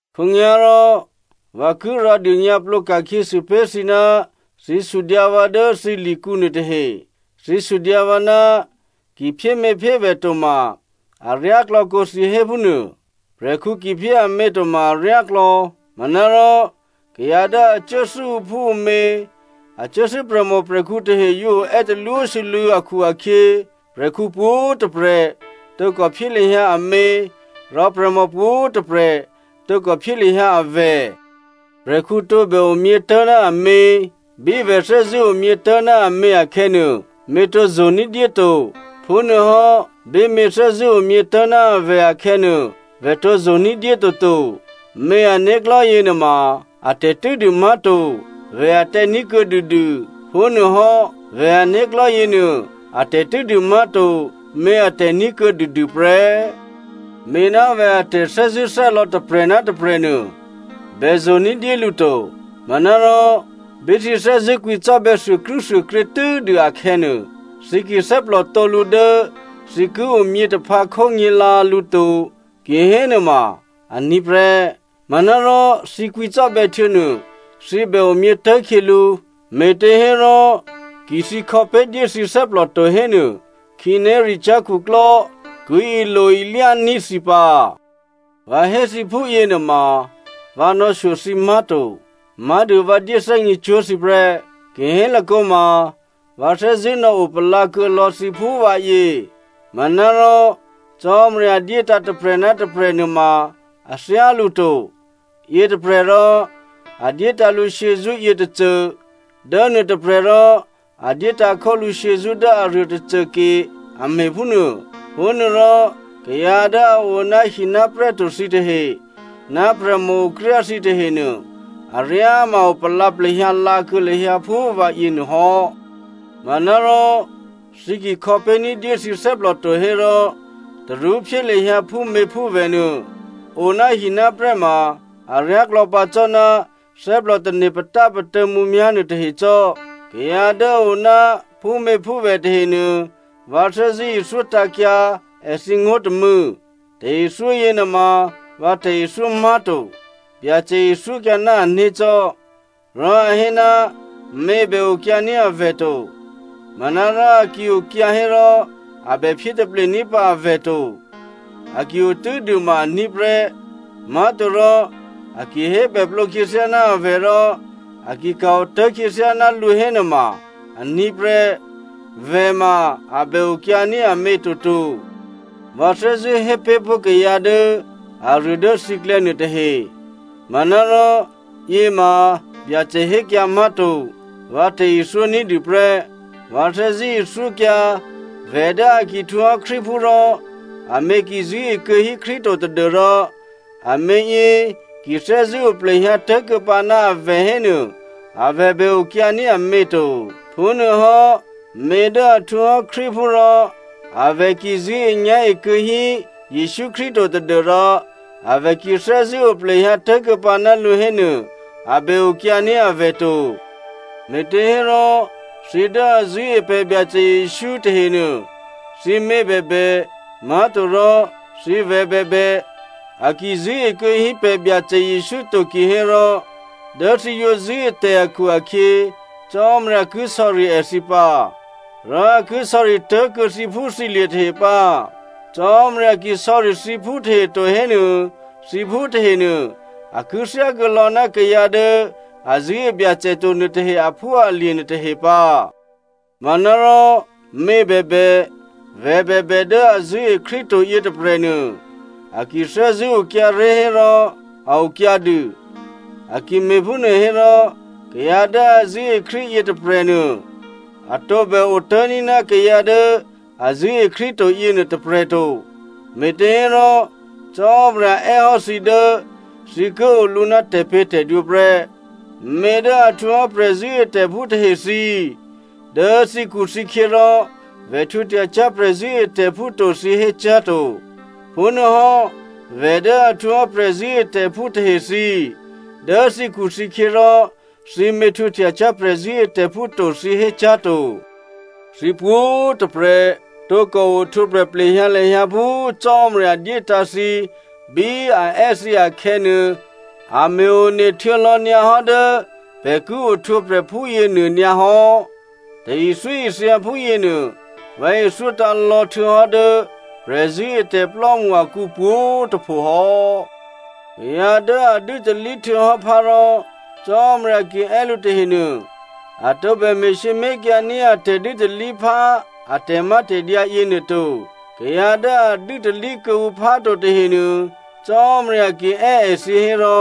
Khǒnyá̤rò, vǎ ki rǎdônyǎplǒ ka̤khyěsû pé̤ thǐ ná thǐ sudyǎ vǎ dố thǐ likǔ nuôtahe. Thǐ sudyǎ vǎ ná ki phyéměphyévè̤ to ma aryáklò̌ kǒ thǐ hé phúnuô. Prè̤khǔ ki phyé amě to ma aryáklò̌. Manárò kayǎ dố a cuốthû́ ǔphúǔmě, a cuốthû́ prè̤mòprè̤khǔ tahe yǒ oè́ talwósû́lû̌ akhu-akhyě, prè̤khǔ pwǒ̤꤮ tôprè̤ tǒkò phyé lahyǎ amě, rò prè̤mò pwǒ̤꤮ tôprè̤ tǒkò phyé lahyǎ avè̤. Prè̤khǔ tǒbè omyě tố̤ ná amě. Bí vè̤ thè́zṳ̂́ omyětố̤ ná amě akhè̌nuô, mě tǒ yo ní̤dyé to, phúnuôhò́, bí mě thè́zṳ̂́ omyětố̤ ná a vè̤ akhè̌nuô, vè̤ tǒ yo ní̤dyé toto. Mě ané̤klò̤́ yěnuôma atè̤ tû́dû má̤to, vè̤ atè̤ní̤ kuô̌ dûdû. Phúnuôhò́ vè̤ ané̤klò̤́ yěnuô a tè̤tû́dû má̤to, mě atè̤ní̤ kuô̌ dûdû prè́. Mě ná vè̤ a tè̤thè́zṳ̂́thè́lò̌ tôprè̤ ná tôprè̤ nuô, bè yo ní̤dyé lǔ to. Manárò bí thǐ thè́zṳ̂́ kwǐcò́bè̌ thuôkrû́thuôkrě tû́dû akhè̌nuô, thǐ ki thè́plòtǒ lǔ dố thǐ ki omyě taphǎ khó nyě̤lǎ lǔ to kihénuôma aní̤ prè́. Manárò thǐ kwǐcò́bè̌ htuô̌nuô, thǐ bè omyětố̤ khyělǔ, me̤těhérò ki thǐ khò̌pé̤ dyé thǐ thè́plò to hénuô, khǐnéricyá̤ khuklò́ ki ilo-ilyání̤ thǐ pǎ. Vǎ hé thǐ phúyěnuôma vǎ nò̌shyo thǐ má̤to. Má̤dû vǎ dyéthè́gně cwó̤ thǐ prè́. Ki hélakǒma vǎ thè́zṳ̂́ nò̌opalǎ kuô̌ lò̌ thǐ phú vǎyě. Manárò Cò́marya dyétǎ̤ tôprè̤ ná tôprè̤ nuôma a thyálǔ to. Yětôprè̤ rò a dyétǎ̤ lǔ shyězṳ́ yětôcô dố nuôtôprè̤ rò a dyétǎ̤ khólǔ shyězṳ́ dố aruô tôcô ke a me̤ phúnuô. Phúnuôrò kayǎ dố a o ná hi ná prè́ to thǐ tahe, ná prè̤mòokryá thǐ tahenuô, aryáma opalǎ plehyǎ lǎ kuô̌ lahyǎ phú vǎ yěnuô hò́. Manárò thǐ ki khò̌pé̤ ní̤dyé thǐ thè́plò to hérò, tarú phyé lahyǎ phúměphúvè̤ nuô. O ná hi ná prè́ ma aryáklò̌ pǎ cò́ ná thè́plò tane̤ patápatô̌ mǔmyá̤ nuôtahe cò́. Kayǎ dố a oná phúměphúvè̤ tahenuô, vǎ thè́zṳ̂́ ithyótǎ̤kyǎ èthǐ ngó̤ tômû̌. Tè̤ithyó yěnuôma vǎ tè̤ithyó má̤to, Byacè ithyókyǎ ná ané̤ cò́. Rò a hé ná mě bè okyǎní̤ avè̤ to. Manárò a ki okyǎ hérò a bèphyé taple ní̤pǎ avè̤ to. A ki o tû́dû ma aní̤ prè́, má̤torò a ki hébèplǒ khyěthyá ná a vè̤ rò a ki ka̤ otố̤kuô̌ khyěthyá ná lǔ hénuôma aní̤ prè́. Vè̤ ma a bè okyǎní̤ amě toto. Vǎ thè́zṳ̂́ hé pé̤ pó̤ kayǎ dố aruô dố thǐklè̌ nuôtahe. (Manárò, yěma Byacè hékyǎ má̤to.) Vǎ tè̤ithyó ní̤dû prè́. Vǎ thè́zṳ̂́ ithyókyǎ vè̤ dố a ki htwǒhò́ Krístuphú rò amě ki zṳ̂́e kuô̌hí Krístu to tadû́rò amě yě ki thè́zṳ̂́ oplehyǎ tố̤kuô̌pǎ ná avè̤ hénuô, avè̤ bè okyǎní̤ amě to. Phúnuôhò́ mě dố a htwǒhò́ Krístuphú rò a vè̤ ki zṳ̂́enyá̤e kuô̌ hí Jesǔ Krístu to tadû́rò avè̤ ki thè́zṳ̂́ oplehyǎ tố̤kuô̌pǎ ná lǔ hénuô, a bè okyǎní̤ avè̤ to. Me̤těhérò, thǐ dố a zṳ̂́e pè̤ Byacè Jesǔ tahenuô, thǐmě bèbè, má̤torò thǐvè̤ bèbè, a ki zṳ̂́e kuô̌ hí pè̤ Byacè Jesǔ to kihérò, dố thǐ yǒ zṳ̂́e tè̤ akhu-akhyě, Cò́marya ki sò̌ri èthǐ pǎ. Rò a ki sò̌ri tố̤kuô̌ thǐphúthǐlye̤ tahe pǎ. Cò́marya ki sò̌ri thǐphú tahe to hénuô, thǐ phú tahenuô a ki thyákuô̌ lò̌ ná kayǎ dố a zṳ̂́e Byacè to nuôtahe aphúalye̤ nuôtahe pǎ. Manárò mě bèbè, vè̤ bèbè dố a zṳ̂́e Krístu to yětôprè̤nuô a ki thè́zṳ̂́ okyǎré̤ hérò a okyǎ dû. A ki me̤phúnuô hérò, kayǎ dố a zṳ̂́e Krístu yětôprè̤nuô a tǒbè otố̤ní̤ ná kayǎ dố a zṳ̂́e Krístu to yěnuô tôprè̤ to. Me̤těhérò Cò́marya è́hò́ thǐ dố thǐ ki olǔ ná tè̤pě̤tè̤dwǒ prè́. Mě dố a htwǒhò́ prè̤zṳ̂́etè̤phú tahe thǐ꤮, dố thǐkhuthǐkhyě rò vè̤ htwǒhtyacyá̤ prè̤zṳ̂́etè̤phú to thǐ hécyá̤ to. Phúnuôhò́ vè̤ dố a htwǒhò́ prè̤zṳ̂́etè̤phú tahe thǐ꤮, dố thǐkhuthǐkhyě rò thǐmě htwǒhtyacyá̤ prè̤zṳ̂́etè̤phú to thǐ hécyá̤ to. Thǐ pwǒ̤꤮ tôprè̤ tǒkò ohtwǒprè̤ plehyǎ lahyǎ phú Cò́marya dyétǎ̤ thǐ bí a è́ thǐ akhè̌nuô. A me̤ one htuô̌ lò̌ nyǎ hò́ dố pè̤ ki ohtwǒprè̤ phúyě nuô nyǎ hò́. Tè̤ithyóithya phúyěnuô, vǎ ithyótǎ̤ lò̌ htuô̌hò́ dố prè̤zṳ̂́etè̤plò́mṳ akǔ pwǒ̤꤮ tôpho hò́. Kayǎ dố a dû́talí htuô̌hò́ phá rò Cò́marya ki è́ lǔ tahenuô, a tǒbè me̤sǐmé̤kyǎ ní̤ a tè̤dû́talíphá a tè̤mátè̤dyǎ yěnuô to. Kayǎ dố a dû́talí kuô̌ǔ phá to tahenuô, Cò́marya ki è́ èthǐ hérò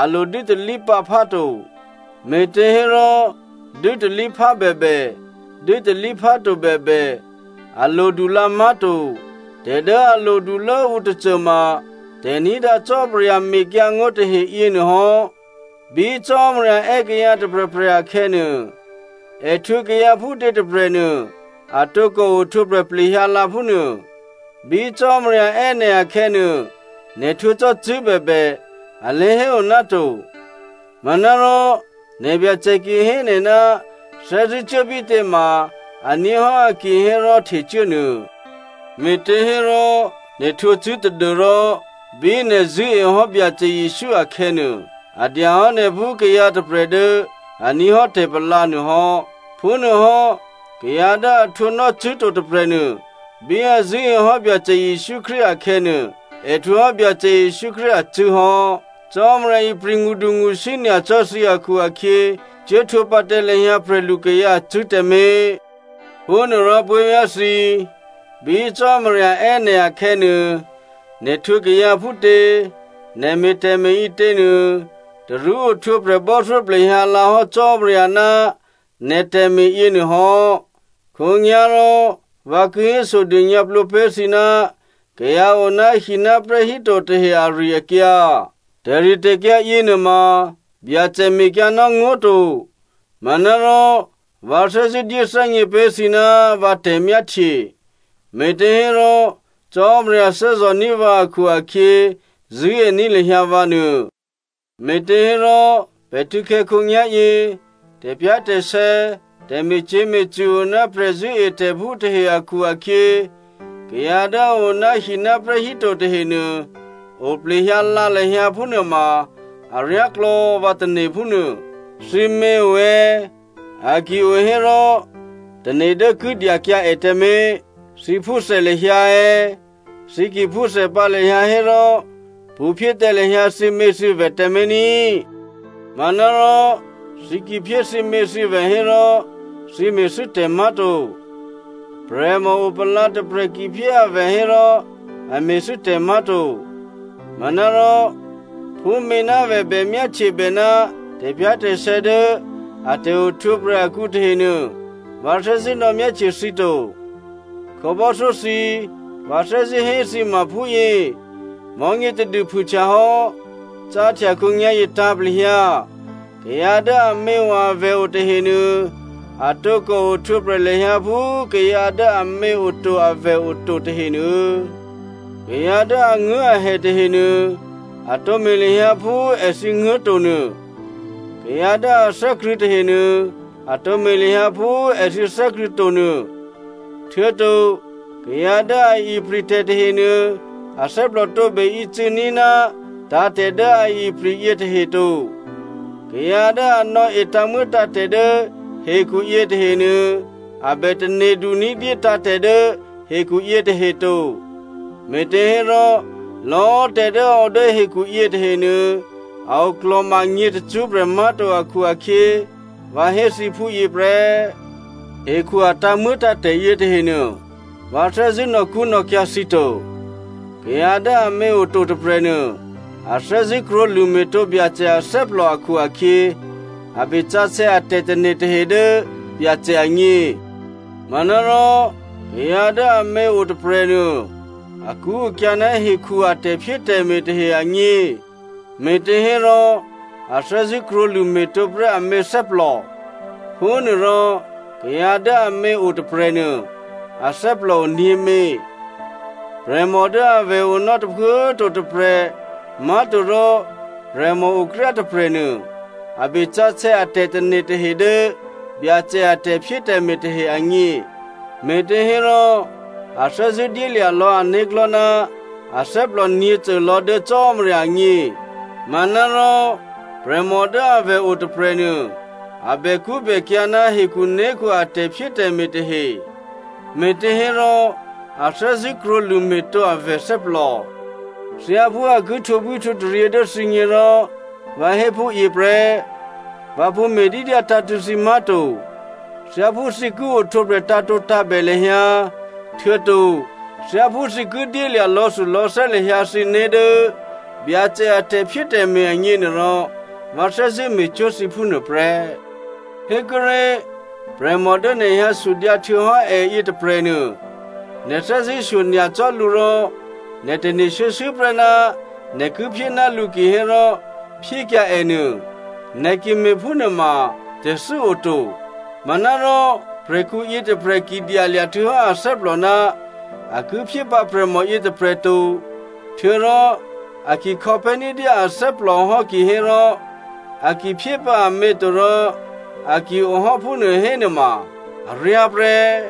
a lo dû́talí pǎ phá to. Me̤těhérò, dû́talíphá bèbè, dû́talíphá to bèbè a lodu lǎ má̤to. Tè̤ dố a lodulố ǔ tôcôma tè̤ní̤dǎ Cò́marya mekyǎngó̤ tahe yěnuô hò́. Bí Cò́marya è́ kayǎ tôprè̤prè̤ akhè̌nuô, è htwǒ kayǎ phútě tôprè̤nuô a tǒkò ohtwǒprè̤ plehyǎ lǎ phúnuô. Bí Cò́marya è́ nè̤ akhè̌nuô, nè̤ htwǒ cò́ cṳ̂́ bèbè, a lé̤héo ná to. Manárò nè̤byacè ki hé nè̤ ná thè́zṳ̂́ cuố bítě ma aní̤ hò́ a ki hé rò htecuố nuô. Me̤těhérò nè̤ htwǒ cṳ̂́ tadû́rò, bí nè̤ zṳ̂́ehò́ Byacè Jesǔ akhè̌nuô, a dyahò́ nè̤ phú kayǎ tôprè̤ dố a ní̤ hò́ tè̤palǎ nuô hò́. Phúnuôhò́ kayǎ dố a htwǒnò́ cṳ̂́ to tôprè̤nuô, bí a zṳ̂́ehò́ Byacè Jesǔ Krístu akhè̌nuô, è htwǒhò́ Byacè Jesǔ Krístu acṳ̂́ hò́. Cò́marya ipri̤ ngṳdungṳsí nyacò́ thǐ akhu-akhyě, cuố htwǒ pǎ tǎ lahyǎ prè̤lukayǎ acṳ̂́ tǎmé̤. Phúnuôrò puố̤vyá̤ thǐ꤮, bí Cò́marya è́ nè̤ akhè̌nuô, nè̤ htwǒ kayǎ phútě, nè̤ me̤ tè̤me̤ ǐtěnuô, tarú ohtwǒprè̤, bò́thyó plehyǎ lǎ hò́ Cò́marya ná nè̤ tè̤me̤ yěnuô hò́. Khǒnyá̤rò vǎ ki hésodônyǎplǒ pé̤ thǐ ná kayǎ o ná hináprè́ híto tahe ari-akyǎ. Tè̤ritè̤kyǎ yěnuôma, Byacè mekyǎnò́ ngó̤ to. Manárò vǎ thè́zṳ̂́ dyéthè́gně pé̤ thǐ ná vǎ tè̤myáhtye. Me̤těhérò Cò́marya thè́zò̤ní̤ vǎ akhu-akhyě, zṳ̂́ení̤ lahyǎ vǎ nuô. Me̤těhérò, pè̤ htû̌khè̌ khǒnyá̤yě, tè̤pyá̤tè̤sè̌, tè̤me̤cyě̤me̤cṳ̂ o ná prè̤zṳ̂́etè̤phú tahe akhu-akhyě, kayǎ dố a o ná hináprè́ híto tahenuô, oplehyǎ lǎ lahyǎ phúnuôma aryáklò̌ vǎ tane̤ phúnuô. Thǐmě o è̌? A ki o hérò tane̤ dố ki dyakyǎ è tǎmé̤. Thǐ phúthè lahyǎ è̌? Thǐ ki phúthè pǎ lahyǎ hérò pṳ̌phyé tǎ lahyǎ thǐměthǐvè̤ tǎmé̤ ní꤮. Manárò thǐ ki phyé thǐměthǐvè̤ hérò thǐ me̤thû́ tè̤ má̤to. Prè̤mò opalǎ tôprè̤ ki phyé avè̤ hérò a me̤thû́ tè̤ má̤to. Manárò phú měnávè̤ bè myáhtyebè ná tè̤pyá̤tè̤sè̌ dố a tè̤ohtwǒprè̤ akǔ tahenuô, vǎ thè́zṳ̂́ nò̌myáhtye thǐ to. Khǒbò́thyó thǐ꤮, vǎ thè́zṳ̂́ hé thǐ ma phúyě: mò̤́nyě tadû phûhtya hò́. Cáhtya khǒnyá̤yě tǎ̤plehyǎ, kayǎ dố aměo avè̤ o tahenuô, a tǒkò ohtwǒprè̤ lahyǎ phú kayǎ dố amě oto avè̤ oto tahenuô. Kayǎ dố anguố̤ahè tahenuô, a tǒ me̤ lahyǎ phú èthǐ nguố̤ to nuô. Kayǎ dố a thè́krṳ̂̌ tahenuô, a tǒ me̤ lahyǎ phú èthǐ thè́krṳ̂̌ to nuô. Htuô̌to kayǎ dố a ipri̤ tè̤ tahenuô, athè́plò tǒbè ícû̌ní̤ ná tǎ̤tè̤ dố a ipri̤ yětahe to. Kayǎ dố a nò̌e tǎ̤muô̌tǎ̤tè̤ dố hekhu yětahenuô, a bè tane̤du ní̤dyé tǎ̤tè̤ dố hekhu yětahe to. Me̤těhérò lò̌꤮ tè̤ dố a o dố hekhu yě tahenuô, a oklò̤ma nyě̤ tacṳ́prè̤ má̤to akhu-akhyě, vǎ hé thǐ phúyě prè́. Hekhu a tǎ̤muô̌tǎ̤tè̤ yětahenuô, vǎ thè́zṳ̂́ nò̌kṳ́nò̌kyǎ̤ thǐ to. Kayǎ dố amě o to tôprè̤nuô, a thè́zṳ̂́ krwǒlṳ̂ me̤tǒ Byacè athè́plò akhu-akhyě, a be sǎsè̌ a tè̤tane̤ tahe dố Byacè agně. Manárò, kayǎ dố amě o tôprè̤nuô, akṳ́akyǎ̤ ná hekhu a tè̤phyétè̤me̤ tahe agně. Me̤těhérò a thè́zṳ̂́ krwǒlṳ̂ me̤tǒ prè́ amě thè́plò. Phúnuôrò, kayǎ dố amě o tôprè̤nuô, athè́plò o nyě̤mě. Prè̤mò dố avè̤ onò́ tôphuố꤮ to tôprè̤, má̤torò prè̤mòokryá tôprè̤nuô, a be sǎsè̌ a tè̤tane̤ tahe dố Byacè a tè̤phyétè̤me̤ tahe agně. Me̤těhérò a thè́zṳ̂́ dyélya̤ lò̌ ané̤klò̤́ ná athè́plò nyě̤côlò̌ dố Cò́marya agně. Manárò prè̤mò dố avè̤ o tôprè̤nuô, a bèkṳ́bèkyǎ̤ ná hekhuné̤khu a tè̤phyétè̤me̤ tahe. Me̤těhérò a thè́zṳ̂́ krwǒlṳ̂ me̤tǒ avè̤ thè́plò. Thyáphú a ki htwǒbwíhtwǒtaryě dố thǐgně rò vǎ hé phúyě prè́. Vǎ pṳ̌ me̤dídyǎ tǎ̤tṳ̂̌ thǐ má̤to. Thyáphú thǐ ki ohtwǒprè̤ tǎ̤tǒtǎ̤bè lahyǎ, htuô̌to thyáphú thǐ ki dyélya̤ lò̌thulò̌thè́ lahyǎ thǐné̤ dố Byacè a tè̤phyétè̤me̤ agněnuôrò, vǎ thè́zṳ̂́ me̤cwó̤ thǐ phúnuô prè́. Hékuốré̤, prè̤mò dố nè̤ hyǎsudyǎ htuô̌hò́ è yětôprè̤nuô, nè̤ thè́zṳ̂́shyo nyacò́ lǔ rò nè̤ tane̤ shuô̌shuô̌ prè́ ná nè̤ ki phyé ná lǔ kihérò, phyékyǎ è nuô. Nè̤ ki me̤phúnuôma tè̤thû́ o to. Manárò prè̤khǔ yětôprè̤ ki dyalya̤ htuô̌hò́ athè́plò ná a ki phyé pǎ prè̤mò yětôprè̤ to, htuô̌rò a ki khò̌pé̤ ní̤dyé athè́plò hò́ kihérò, a ki phyépǎ amě to rò a ki-o hò́ phúnuô hénuôma aryá prè́.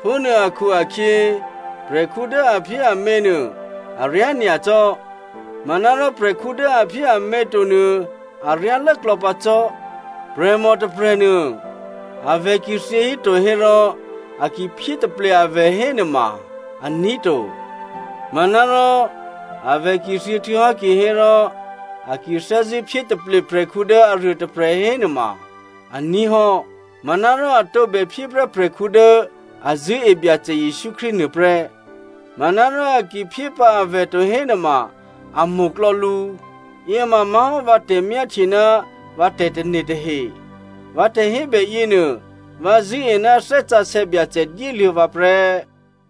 Phúnuô akhu-akhyě, prè̤khǔ dố a phyé amě nuô aryá nyacò́, manárò prè̤khǔ dố a phyé amě to nuô aryá lốklò̌ pǎ cò́. Prè̤mò tôprè̤nuô, avè̤ ki thyěhíto hérò a ki phyé taple avè̤ hénuôma aní̤ to. Manárò avè̤ ki thyě htuô̌hò́ kihérò a ki thè́zṳ̂́ phyé taple prè̤khǔ dố aruôtôprè̤ hénuôma aní̤ hò́. Manárò a tǒbè phyé prè́ prè̤khǔ dố a zṳ̂́e Byacè Jesǔ Krístu nuô prè́. Manárò a ki phyé pǎ avè̤ to hénuô, a mo̤klò̌ lǔ. Yěma má̤hò́ vǎ tè̤myáhtye ná vǎ tè̤tane̤ tahe. Vǎ tè̤hébè yěnuô, vǎ zṳ̂́e ná Thè́ Sǎsè̌ Byacè dyéluô̌ vǎ prè́.